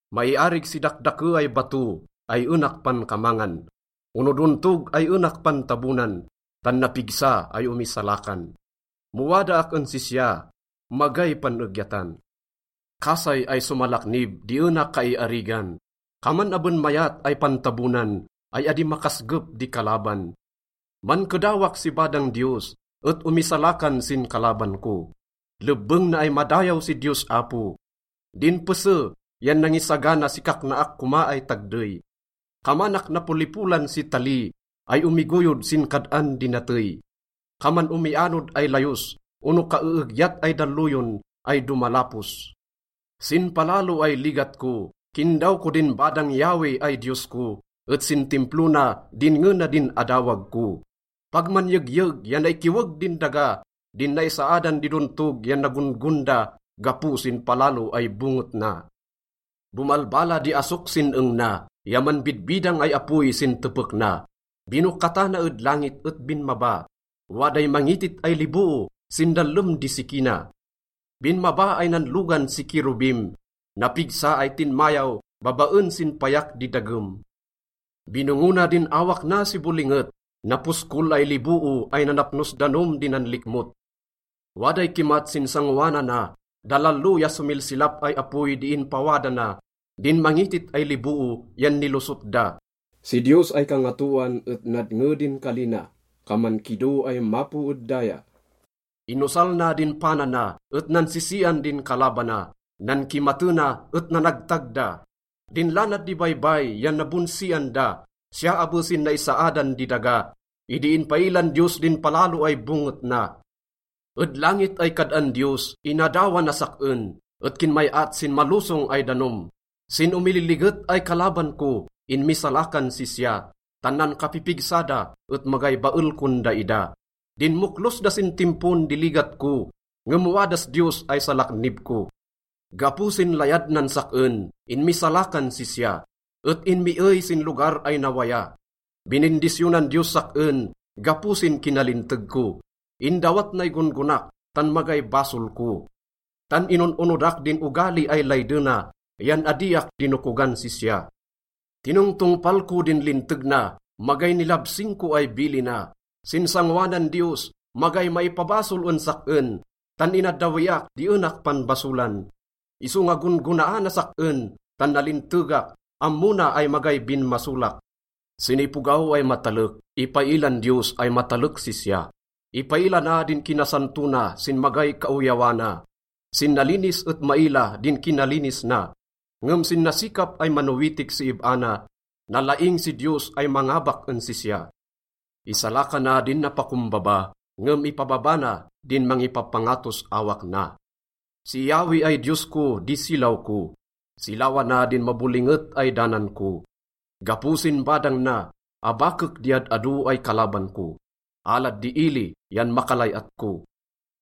Maiarig si dakdake ay bato ay enak pankamangan ono dontog ay enak pantabonan, tan napigsa ay omisalakan. Mo wadaak en sisya, magay pan-egyatan. Kasay ay somalaknib di ena kaiarigan, kaman aben mayat ay pantabonan ay adi makasgep di kalaban. Mankedawak si badang Diyos et omisalakan sin kalaban ko. Lebbeng na ay madayaw si Diyos Apo. Din pese yan nangisagana si kaknaak koma ay tagdey. Kamanak napolipolan si tali ay omigoyod sin kad-an di natey, kaman omianod ay layos ono kaeegyat ay dalloyon ay domalapos. Sin palalo ay ligat ko, kindaw ko din badang Yahweh ay Diyos ko, et sin Timplo na, dinnge na din adawag ko. Pag manyegyeg ya naikiweg din daga, din naisaadan di dontog yan nagon-gon da gapo sin palalo ay bonget na. Bomalbala di asok sin eng na ya manbidbidang ay apoy sin tepek na. Binokatana ed langit et binmaba, waday mangitit ay liboo sin dallem di siki na. Binmaba ay nanlogan si kerubim, napigsa ay tinmayaw babaen sin payak di dagem. Binongona din awak na si bolinget, naposkol ay liboo ay nanapnos danom di nanlikmot. Waday kimat sin sangoanana, dalalo ya somilsilap ay apoy di inpawada na, din mangitit ay liboo yan nilosot da. Si Diyos ay kangatoan et nadnge din kali na, kaman kido ay mapo ed daya. Inosal na din pana na et nansisian din kalabana. Nankimatena et nanagtag da. Din lanad di baybay yan nabonsian da, siya abe sin naisaadan di daga, idi inpailan Diyos din palalo ay bonget na. Ed langit ay kad-an Diyos, inadawa nas sak-en, et kinmay-at sin malosong ay danom. Sin omililiget ay kalaban ko, inmisalakan sisya, tan nankapipigsa da et magay bael kon daida. Dinmoklos da sin timpon di ligat ko, ngem wadas Diyos ay salaknib ko. Gapo sin layad nan sak-en, inmisalakan sisya, et inmiey sin lugar ay nawaya. Binindisyonan Diyos sak-en gapo sin kinalinteg ko, indawat nay gon-gonak tan magay basol ko. Tan inon-onodak din ogali ay laydena, yan adiak dinokogan sisya. Tinongtongpal ko din linteg na, magay nilabsing ko ay bilina. Sin sangoanan Diyos, magay maipabasol en sak-en, tan inaddawiak di enak panbasolan. Isonga gon-gonaanas sak-en tan nalintegak, ammo na ay magay binmasolak. Sin ipogaw ay matalek, ipailan Diyos ay matalek sisya, ipaila na din kinasanto na sin magay kaoyawana. Sin nalinis et maila din kinalinis na, ngem sin nasikap ay manowitik si ib-a na, nalaing si Diyos ay mangabak en sisya. Isalakana din napakombaba, ngem ipababa na din mangipapangatos awak na. Si Yahweh ay Diyos ko di silaw ko, silawana din mabolinget ay danan ko. Gapo sin badang na, abakek di ad-ado ay kalaban ko, alad di ili yan makalay-at ko.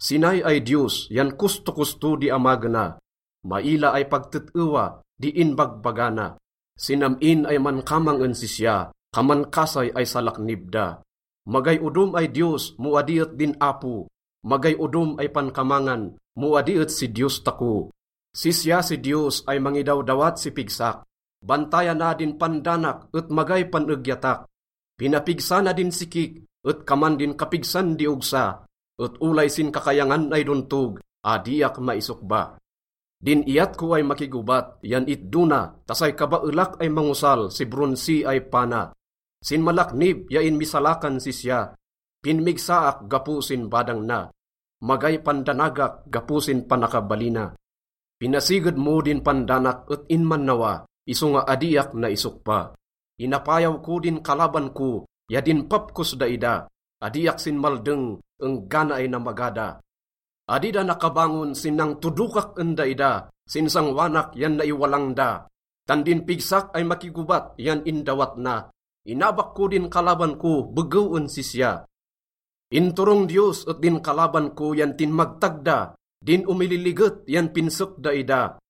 Sinay ay Diyos yan kostokosto di amagena, maila ay pag tet-ewa di inbagbaga na. Sin am-in ay mankamang en sisya, kaman kasay ay salaknib da. Magay odom ay Diyos mo adi et din Apo. Magay odom ay pankamangan mo adi et si Diyos tako. Sisya si Diyos ay mangidawdawat si pigsak, bantayana din pandanak et magay pan-egyatak. Pinapigsa na din sikik et kaman din kapigsan di ogsa, et olay sin kakayangan ay dontog, adiak maisokba. Din iyat ko ay makigobat yan itdo na ta say kabaelak ay mangosal si bronsi ay pana. Sinmalaknib ya inmisalakan sisya, pinmigsaak gapo sin badang na. Magay pandanagak gapo sin panakabalina. Pinasiged mo din pandanak et inmannawa, isonga adiak naisokba. Inapayaw ko din kalaban ko ya dinpap kos daida, adiak sinmaldeng enggana ay namaga da. Adi da nakabangon sin nangtodokak en daida, sin sangoanak yan naiwalang da. Tan din pigsak ay makigobat yan indawat na, inabak ko din kalaban ko begew en sisya. Inturong Diyos et din kalaban ko yan tinmagtag da, din omililiget yan pinsek daida.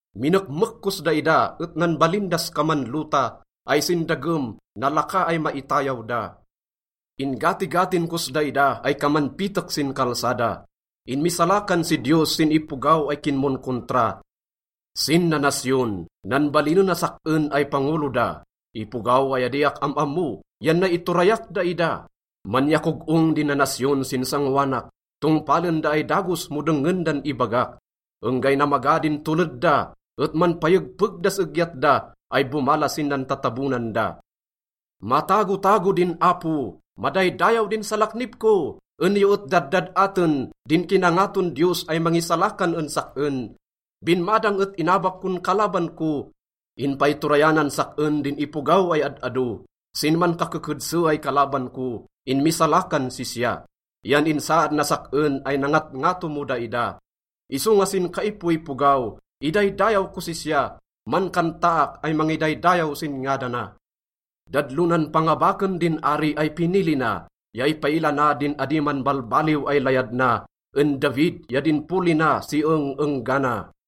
Minekmek kos daida et nanbalin das kaman lota ay sin dagem, nalaka ay maitayaw da. In-gatigatin kos daida ay kaman pitek sin kalsada. Inmisalakan si Diyos sin ipogaw ay kinmonkontra, sin nanasyon, nanbalinenas sak-en ay pangolo da, ipogaw ay adiak am-ammo, yan nay iturayak daida. Manyakog-ong din nanasyon sin sangoanak, tongpalen da ay dagos mo dengngen dan ibagak. Enggay namaga din toled da, et manpayegpeg das egyat da ay bomala sin nantatabonan da. Matagotago din Apo! Madaydayaw din salaknib ko! En yo et daddad-aten din kinangaton Diyos ay mangisalakan en sak-en. Binmadang et inabak kon kalaban ko, inpaiturayanan sak-en din ipogaw ay ad-ado. Sin mankakekedse ay kalaban ko, inmisalakan sisya, yan insaad nas sak-en ay nangatngato mo daida. Isonga sin kaipoipogaw, idaydayaw kos sisya, mankantaak ay mangidaydayaw sin ngadana. Dadlonan pangabaken din ari ay pinili na, ya ipaila na din adi manbalbaliw ay layad na en David ya din poli na si eng-enggana.